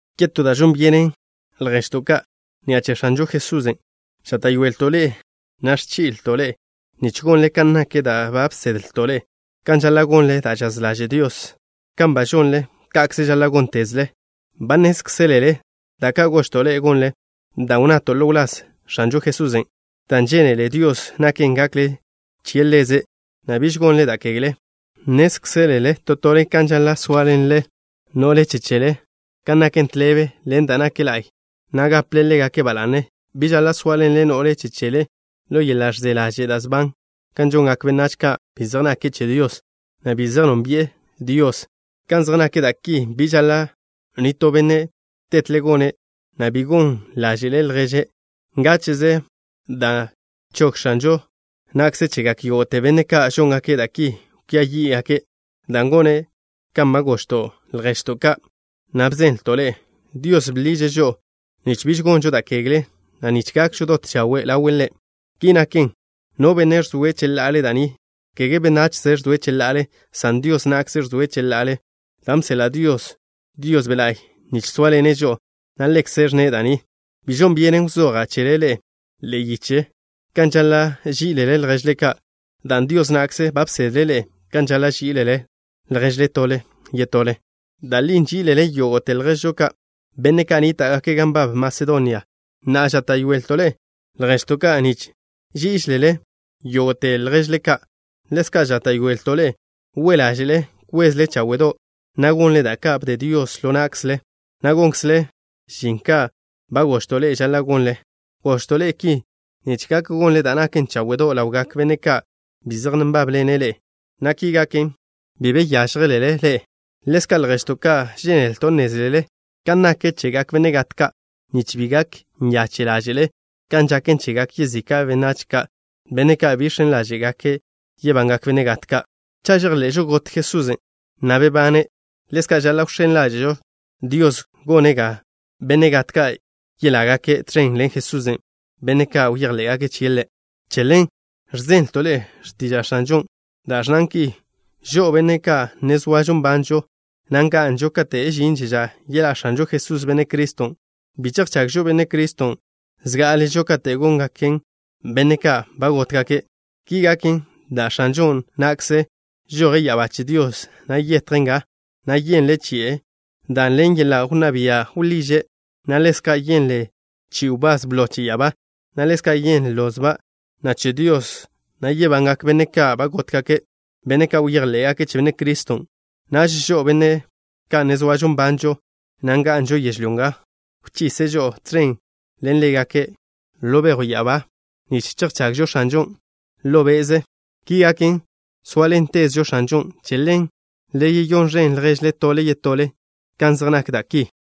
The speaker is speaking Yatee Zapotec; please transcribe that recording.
Yetó da' žon byenen, lježto' ka', ni'a che X̱anžo Jesusen' žáta'yoelto' ḻe'e, na' ẕchí'leto' ḻe'e nich gonle kan nak da' ba bsedlto' ḻe'e kan žaḻa' gonle da' žaz ḻaže' Dios. Kan ba žonle, ka'kze žaḻa' góntezle. Ba nnézkzelele da' ka' gožto' ḻe'e gonle, dan' wnnato' ḻo wláz X̱anžo Jesusen'. Da' žénele Dios naken gakle che Ḻeze', na' biž gonle da' kegle. Nnézlele to tole kan žaḻa' sóaḻenle no'le che chele kan naken tḻebe ḻen da' nak la'y, na' gaple ḻégake' ba la'ne. Bi žaḻa' sóaḻenle no'le chele ḻo yeḻa' ẕze ḻaže' da' sban, kan žongak benách ka' bi zej nake' che Dios, na' bi zej nónbi'e Dios. Kan zej nak da' ki, bi žaḻa' nitó benne' tetle gone', na' bi gon ḻáže'le' lježe' ngáche'ze, dan' chog X̱anžo na'kze chegak yógo'te benne' ka' žóngake' da' ki kwia yí'gake', dan' gone' kan ba gožto' lježto' ka', na' bzenlton' ḻe'e. Dios bḻiže' žo'o, nich biž gonžo da' kegle, na' nich gakžo dot chawe' ḻawe' Ḻe'. Ki naken, no benne' ẕzoe' cheḻa'ale da' ni, kege benachze ẕzoe' cheḻa'ale, san Dios na'kze ẕzoe' cheḻa'ale, dan' bseḻa' Dios Dios Be' La'y nich sóaḻene' žo'o, na' Ḻekze' ẕnne' da' ni. Bi žon byenen wzoja' chele ḻe'e ḻe'e yiche kan žaḻa' ží'ilele lježle ka', dan' Dios na'kze ba bsedle' ḻe'e kan žaḻa' ží'ilele lježle tole yetole. Da' li nží'ilele yógo'te lježžo ka', benne' ka' nníta'gake' gan nbab Masedonia. Na'a, žáta'yoelto' ḻe'e, lježto' ka', nich ží'iželele yógo'te lježle ka'. Ḻezka' žáta'yoelto' ḻe'e we' ḻáže'le kwezle cháwe'do', na' gonle da' ka' bde Dios ḻo na'kzle, na' gonkzle žin kan ba gožto' ḻe'e žaḻa' gonle. Gožto' ḻe'e ki nich gak gonle da' naken cháwe'do' ḻawgak benne' ka' bi zej nbábḻene' ḻe'e, na' ki gaken, bi be yážjelele ḻe'e. Ḻezka', lježto' ka', žénelto' nnézlele kan nak chegak benne' gat ka', nich bi gak nyache' ḻáže'le kan žaken chegak yezika' benách ka', benne' ka' bi žx̱en ḻáže'gake' yebangak benne' gat ka'. Cha' žejḻe'žo got Jesusen', na' bebane', ḻezka' žaḻa' wx̱én ḻáže'žo Dios, gone' ga benne' gat ka' yeḻá'gake' tẕen ḻen Jesusen', benne' ka' bejḻé'gake' chie' Ḻe'. Che ḻen ẕzenlto' ḻe'e x̱tiža' X̱anžon' da' ẕnnan ki: “Žo'o, benne' ka' ne zoažo nbanžo, na' nga'nžo kate' žinže ža yeḻá' X̱anžo Jesús, Benne' Criston', bi chejchagžo Benne' Criston' zgá'aležo kate' góngaken benne' ka' ba gótgake'.” Ki gaken dan' X̱anžo na'kze žoje' ya'abá che Dios, na' yetje' nga, na' yenle chi'e dan' ḻen yeḻa' wnná bia' wḻiže', na' ḻezka' yenle chi'i wbás blo che ya'abá, na' ḻezka' yenle lozba' na' che Dios, na' yebangak benne' ka' ba gótgake', benne' ka' bejḻé'gake' che Benne' Criston'. Naž žo'o, benne' ka' ne zoažo nbanžo, na' nga'nžo yežlyó nga, wchise' žo'o tẕen ḻen ḻégake' ḻo bejw ya'abá nich chejchagžo X̱anžon' ḻo be'ze. Ki gaken, sóaḻentezžo X̱anžon'. Che ḻen, le yeyón ẕen ḻježle tole yetole kan zej nak da' ki.